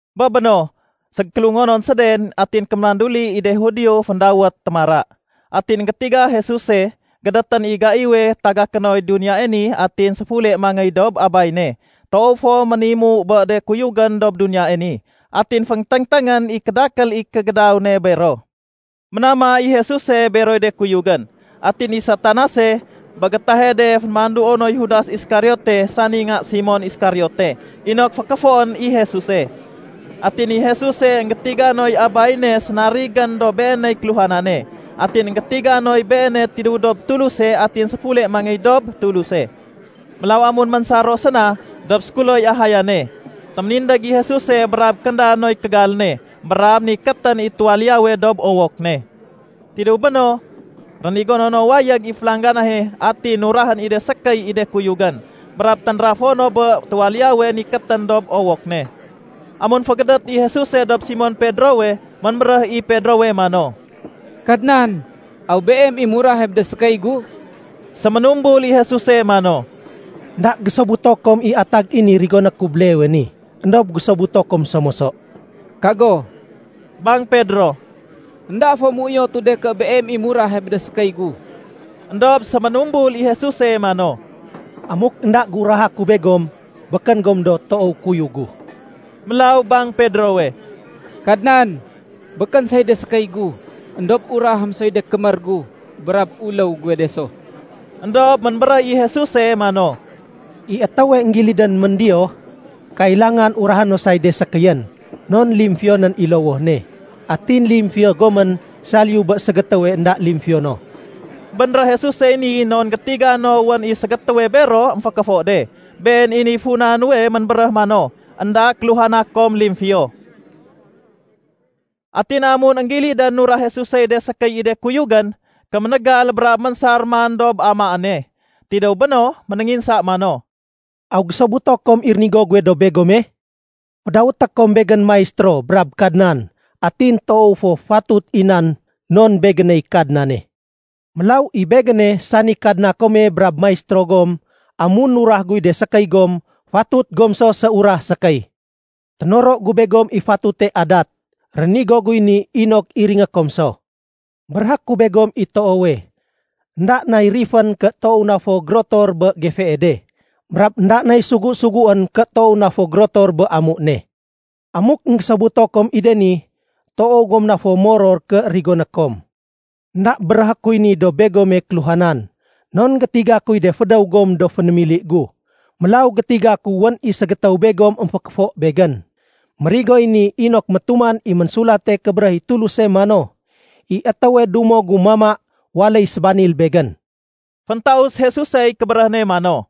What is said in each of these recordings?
Bé béno, ségékélungonon séden atin kémanduli i de Judio féndawét “Témara”. Atin énggétiga Jesuse, gédétén i gaiwe tagaké noy duniyae ni atin séfule mangéy dob Abay ne. Toow fo ménimu bé de kuyugén dob duniyae ni, atin fénténgténgén i kédakél i kégédaw ne bero. Ménama i Jesuse beroy de kuyugén. Atin i Satanase, bé gétahe de fénémanduo noy Judas Iskariote sani nga Simon Iskariote inok fékéfoén i Jesuse. Atin i Jesuse énggétiga noy Abay ne sénarigén dob Beeney kéluhanane. Atin énggétiga noy Beene tidéw dob Tuluse atin séfule mangéy dob Tuluse. Mélaw amun ménsar ro séna dob sékuloy ahayane, téménindég i Jesuse brab kénda noy kégal ne brab nikétén i tuwaliyawe dob owok ne. Tidéw béno, rénigono no wayég i félangganahe atin nurahén i de sékéy i de kuyugén, brab ténrafo no bé tuwaliyawe nikétén dob owok ne. Amun fégédét i Jesuse dob Simon Pedrowe, ménbéréh i Pedrowe mano, “Kadnan, aw Beem i murahe bé de sékéy gu?” Séménumbul i Jesuse mano, “Enda gésobuto kom i atag i ni rigoné ku béleewe ni, éndob gésobuto kom so moso.” “Kago”, bang Pedro. “Enda fo méuyotu de ké Beem i murahe bé de sékéy gu.” Endob séménumbul i Jesuse mano, “Amuk énda géuraha ku begom, békén gom do toow kuyug gu.” Mélaw bang Pedrowe, “Kadnan, békén say de sékéy gu, éndob urahém soy de kémér gu brab uléw guwe de so.” Endob ménbéréh i Jesuse mano, “I étéwe énggilidén méndiyoh, kailangan urahé no say de sékéyén, non limfiyonén i lowoh ne. Atin limfiyo gomén saliyu bé ségétéwe énda limfiyo no.” Bénréh Jesusey ni non gétiga no wén i ségétéwe bero émfékéfo de. Been i niy funa nuwe ménbéréh mano, “Enda kéluhana kom limfiyo.” Atin amun énggilidén nurah Jesusey de sékéy i de kuyugén, kéménégal brab ménsar man dob amaane. Tidéw béno, ménénginsa mano, “Aw énggésobuto kom i rénigo guwe dob begome? Fédawété kom Begén ‘Maistéro’ brab ‘Kadnan’, atin toow fo fatut i nan non Begéney Kadnane. Mélaw i Begéne, sani Kadna kome brab Maistéro gom, amun nurah guy de sékéy gom, fatut gom so séurah sékéy. Ténoro gu begom i fatute adat. Rénigo guy ni inok iringé kom so. Béréhé ku begom i toowe, énda nay rifén ké toow na fo gérotor bé gefee de, brab énda nay sugu-suguén ké toow na fo gérotor bé amu ne. Amuk énggésobuto kom i de ni, toow gom na fo moror ké rigoné kom. “Enda béréhé kuy ni dob begome kéluhanan, non gétiga kuy de fédéw gom do fénémili gu. Mélaw gétiga ku wén i ségétéw begom émfékéfo Begén. Mérigoy ni inok métuman i Ménsulate Kébéréh i Tuluse mano, ‘I étéwe dumo gu mama waléy sébanil Begén.’” Féntaus Jesusey kébéréh ne mano,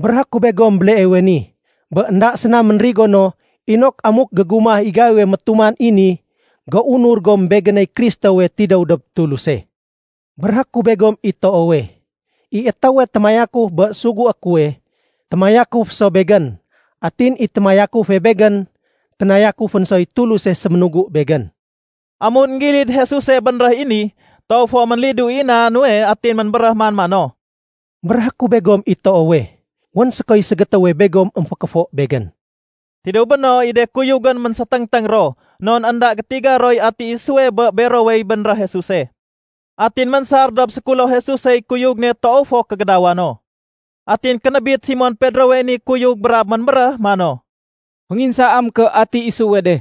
“Béréhé ku begom béleewe ni, bé énda séna ménrigo no inok amuk gégumah i gaiwe métuman i ni, géunur gom Begéney Kristowe tidéw dob Tuluse. Béréhé ku begom i toowe, i étéwe témayakuf bé sugué kuwe, témayakuf so Begén. Atin i témayakufe Begén, ténayakufén soy Tuluse séménugu Begén.” Amun énggilid Jesuse bénréh i ni, toow fo ménlidu i na nuwe atin ménbéréh man mano, “Béréhé ku begom i toowe, wén sékoy ségétéwe begom émfékéfo Begén.” Tidéw béno, i de kuyugén ménggéséténgténg ro, non énda gétiga roy ati isuwe bé berowey bénréh Jesuse. Atin ménsar dob sékulo Jesusey kuyug ne toow fo kégédawa no. Atin kénébit Simon Pedrowey ni kuyug brab ménbéréh mano, “Fénginsaém ké ati isuwe de.”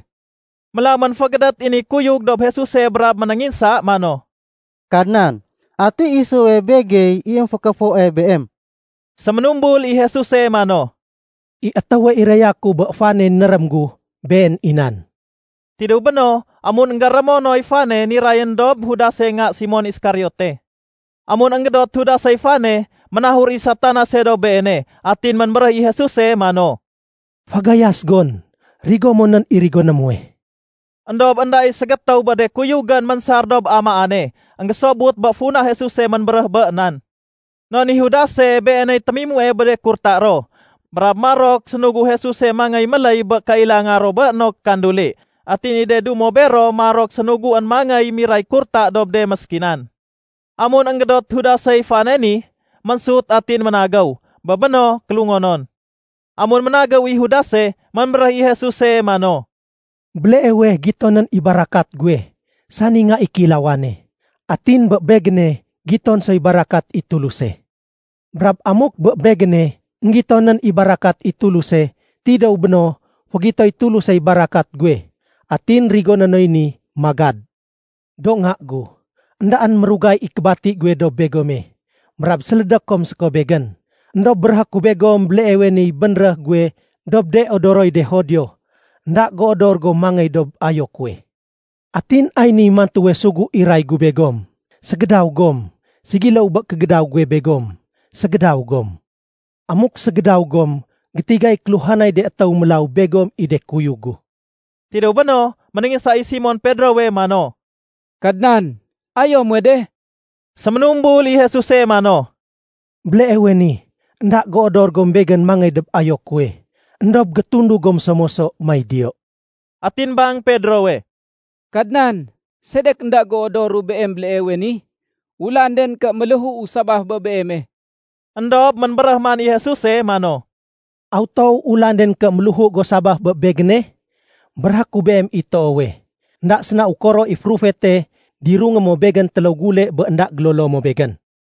Mélaw ménfégédét i ni kuyug dob Jesuse brab ménénginsa mano, “Kadnan, ati isuwe begey i émfékéfoe Beem?” Séménumbul i Jesuse mano, “I étéwe iraya ku bé fane nérém gu, been i nan.” Tidéw béno, amun énggérémo noy fane, nirayén dob Judase nga Simon Iskariote. Amun énggédot Judasey fane, ménahur i Satanase dob Beene. Atin ménbéréh i Jesuse mano, “Fagayas gon, rigo mo nén i rigoné muwe.” Endob énda i ségétéw bé de kuyugén ménsar dob amaane, énggésobut bé funa Jesuse ménbéréh bé nan. Non i Judase beeney témimue bé de kurta ro, brab marok sénugu Jesuse mangéy méléy bé de kailanga ro bé no kékanduli. Atin i de dumo bero marok sénuguén mangéy miray kurta dob de méskinan. Amun énggédot Judasey fane ni, ménsut atin ménagéw. Bé béno, kélungonon. Amun ménagéw i Judase, ménbéréh i Jesuse mano, “Béleewe gitonén i barakat guwe sani Nga i Kéilawane. Atin bé Begéne, giton soy barakat i Tuluse. Brab amuk bé Begéne, énggitonén i barakat i Tuluse, tidéw béno fégitoy Tulusey barakat guwe. Atin rigoné noy ni magad. Do nga gu, éndaén mérugay i kébati guwe dob begome, brab sélédé kom séko Begén. Endob béréhé ku begom béleewe niy bénréh guwe dob de odoroy de Judio, ‘Enda géodor gom mangéy dob ayo kuwe.’ Atin ay niy mantuwe sugu iray gu begom: Ségédaw gom. Ségiléw bé kégédaw guwe begom, ségédaw gom. Amuk ségédaw gom, gétigay kéluhanay de étéw mélaw begom i de kuyug gu.” Tidéw béno, ménénginsa i Simon Pedrowe mano, “Kadnan, ayo muwe de?” Séménumbul i Jesuse mano, “Béleewe ni, énda géodor gom Begén mangéy dob ayo kuwe. Endob gétundug gom so moso may diyo.” Atin bang Pedrowe, “Kadnan, sedek énda géodoru Beem béleewe ni? Ulan den ké méléhuu sabaf bé Beeme.” Endob ménbéréh man i Jesuse mano, “Aw toow ulan den ké méléhu go sabaf bé Begéne? Béréhé ku beem i toowe, énda séna ukoro i férufete, dirungé mo Begén téléw gule bé énda gélolo mo Begén.”